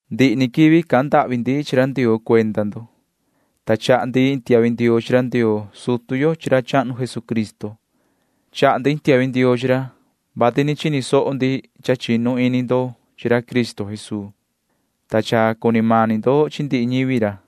Ndihi ni quivi cahan ndahvi ndi chi ra Ndioo cuenda ndo. Tacan ni chaha ndi iin tiahvi ndioo chi ra Ndioo sutu yo chi ra chahnu Jesucristo. Chaha ndi iin tiahvi ndioo chi ra, vati ni chini soho ndi ti cha chinu ini ndo chi ra Cristo Jesuu, ta cha cuni mani ndo chi ndihi ñivi ra.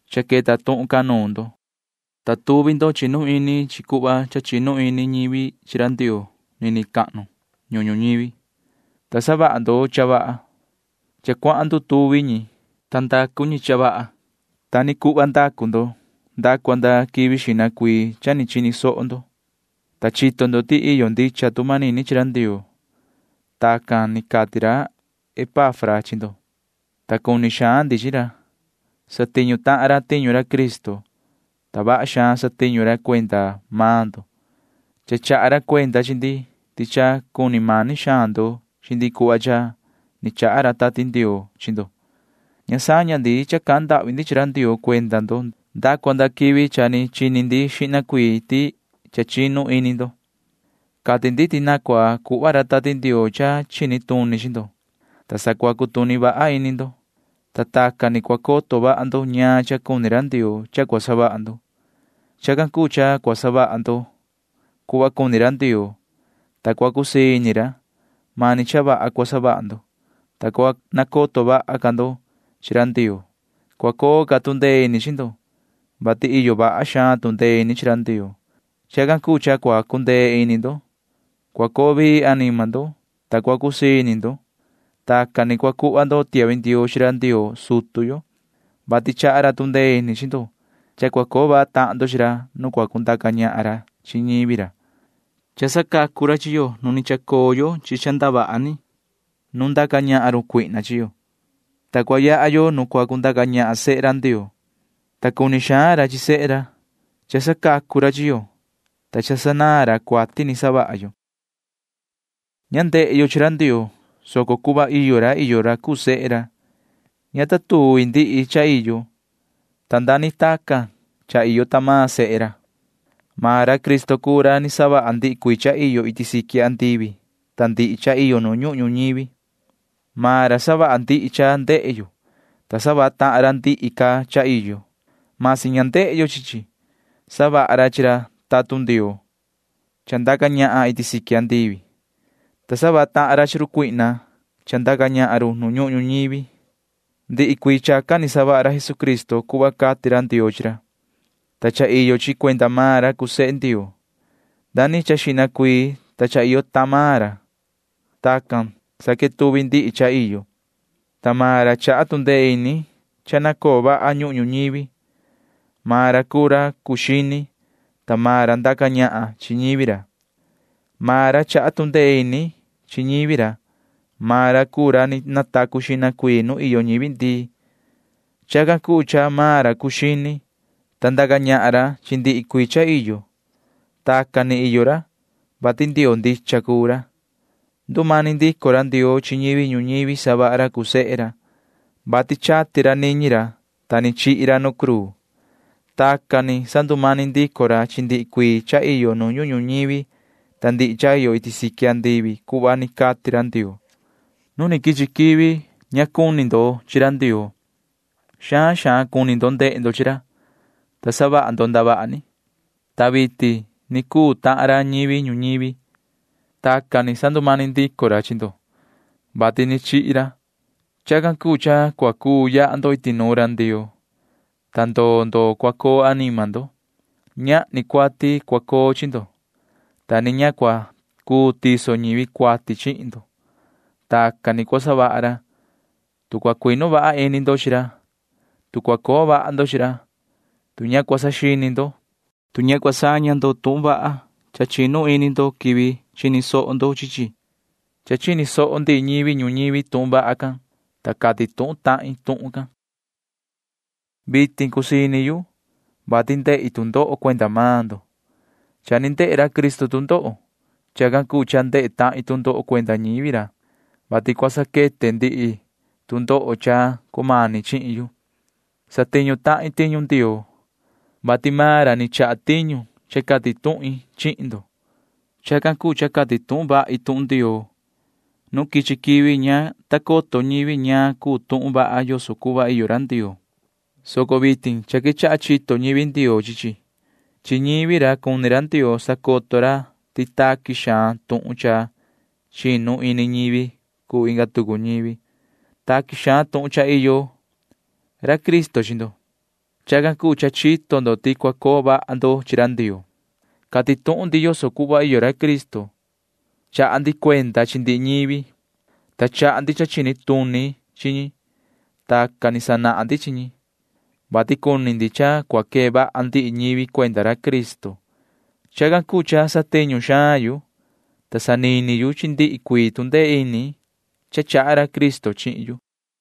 Cha queta tuhun can nuun ndo, ta tuvi ndo chinu ini chi chi cuhva cha chinu ini ñivi chi ra Ndioo nini cahnu ñuhun ñuñivi, ta savaha ndo cha vaha. Cha cuahan ndutuvi ñi, ta ndacu ñi cha vaha. Ta ni cuhva ndacu maan ndo nda cua nda quivi xihna cuii cha ni chini soho ndo, ta chito ndo ti cha iyo ndicha tu manini chi ra Ndioo. Tacan ni cati ra Epafra chi ndo, ta cuni xaan ndi chi ra. Satiñu tahan ra tiñu ra Cristo, ta vaha xaan satiñu ra cuenda maan ndo. Cha chaha ra cuenda chi ndi ti cha cuni mani xaan ndo chi ndi cuhva cha ni chaha ra Tati Ndioo chi ndo. Ña saña ndi cha cahan ndahvi ndi chi ra Ndioo cuenda maan ndo nda cua nda quivi cha ni chini ndi xihna cuii ti cha chinu ini ndo. Cati ndi ti na cua cuhva ra Tati Ndioo cha chini tuni chi ndo, ta sa cua cutuni vaha ini ndo, ta tacan ni cua coto vaha ndo ñaan cha cuni ra Ndioo cha cua savaha ndo. Chacan cuu cha cua savaha ndo cuhva cuni ra Ndioo, ta cua cusii ini ra. Mani cha vaha cua savaha ndo, ta cua nacoto vaha ca ndo chi ra Ndioo. Cua coo ca tu ndee ini chi ndo, vati iyo vaha xaan tu ndee ini chi ra Ndioo. Chacan cuu cha cua cundee ini ndo. Cua coo vii anima ndo, ta cua cusii ini ndo. Tacan ni cua cuhva ndo tiahvi ndioo chi ra Ndioo sutu yo, vati chaha ra tu ndee ini chi ndo cha cua coo vaha tahan ndo chi ra nu cua cundaca ñahan ra chi ñivi ra. Cha sacacu ra chi yo nu ni chacoo yo chi ndavaha ni nu ndaca ñahan run cuihna chi yo, ta cua yaha yo nu cua cundaca ñahan sehe ra, ta cuni xaan ra chi sehe ra. Cha sacacu ra chi yo, ta cha sanaan ra cuati ni savaha yo. Ña ndehe yo chi ra Ndioo, soco cuhva iyo ra iyo ra cuu sehe ra. Ña ta tuvi ndihi cha iyo, ta nda ni tacan cha iyo sehe ra. Maan ra Cristo cuu ra ni savaha ndihi cuii cha iyo iti siqui andivi ta ndihi cha iyo nu ñuhun ñuñivi. Maan ra savaha ndihi cha ndehe yo, ta savaha tahan ra ndihi ca cha iyo―masi ña ndehe yo chi chi. Savaha ra chi ra tatun Ndioo cha ndaca ñahan iti siqui andivi, ta savaha tahan ra chi run cuihna cha ndaca ñahan nu ñuhun ñuñivi. Ndihi cuii chacan ni savaha ra Jesucristo cuhva cati ra Ndioo chi ra, ta cha iyo chi cuenda maan ra cuu sehe Ndioo. Xihna ca cha iyo maan ra. Tacan sa quetuvi ndihi cha iyo, ta maan ra chaha tu ndee ini cha na coo vaha ñuhun ñuñivi. Maan ra cuu ra cuu xini, ta maan ra ndaca ñahan chi ñivi ra. [Maan ra chaha tu ndee ini chi ñivi ra.] Maan ra cuu ra ni natacu xihna cuii nu iyo ñivi ndii. Chacan cuu cha maan ra cuu ra cuu xini, ta ndaca ñahan ra chi ndihi cuii cha iyo. Tacan ni iyo ra, vati Ndioo ndicha cuu ra. Ndumani ndico ra Ndioo chi ñivi ñuñivi savaha ra cuu sehe ra, vati chati ra niñi ra, ta ni chihi ra nu cruu. Tacan ni sandumani ndico ra chi ndihi cuii cha iyo nu ñuhun ñuñivi ta ndihi cha iyo iti siqui andivi cuhva ni cati ra Ndioo. Nu ni quichi quivi ña mani cuni ndo chi ra Ndioo. Xaan xaan cuni ndo chi ra, ta savaha ndo ndavaha ni, ta vitin ni cuu tahan ra ñivi ñuñivi. Tacan ni sandumani ndico ra chi ndo, vati ni chihi ra. Chacan cuu cha cua cuu yaha ndo iti nuun ra Ndioo, ta ndoo ndoo cua coo anima ndo. Ñahni cuati cua coo chi ndo, ta ni ña cua cuu tiso ñivi cuati chihin ndo. Tacan ni cua savaha ra, tu cua cuinu vaha ini ndo chi ra, tu cua coo vaha ndo chi ra, tu ña cua saxini ndo, tu ña cua saña ndo tuhun vaha cha chinu ini ndo quivi chini soho ndo chi chi. Cha chini soho ndihi ñivi ñuñivi tuhun vaha can, ta yuhu cati tuhun tahin tuhun can. Vitin cusii ini yu, vati ndehi tu ndoho cuenda maan ndo. Cha ni ndehe ra Cristo tu ndoho. Chacan cuu cha ndehe tahin tu ndoho cuenda ñivi ra, vati cua saquete ndihi tu ndoho cha cumani chihin yu. Satiñu tahin tiñu Ndioo, vati maan ra ni chaha tiñu cha cati tuhin chihin ndo. Chacan cuu cha cati tuhun vahi tuhun Ndioo. Nu quichi quivi ña ta coto ñivi ñaan cha cuu tuhun vaha yoso cuhva iyo ra Ndioo, soco vitin cha quechaha chito ñivi Ndioo chi chi. Chi ñivi ra cuni ra Ndioo sacoto ra ti taqui xaan tuhun ya cha chinu ini ñivi cuu inga tucu ñivi. Taqui xaan tuhun cha iyo ra Cristo chi ndo. Chacan cuu cha chito ndo ti cua coo vaha ndo chi ra Ndioo. Cati tuhun ndi yoso cuhva iyo ra Cristo. Chaha ndi cuenda chi ndihi ñivi, ta chaha ndi cha chini tuni chi ñi. Tacan ni sanahan ndi chi ñi, vati cuni ndi cha cua quee vaha ndihi ñivi cuenda ra Cristo. Chacan cuu cha satiñu xaan yu, ta sanini yu chi ndihi cuii tu ndee ini cha chaha ra Cristo chihin yu.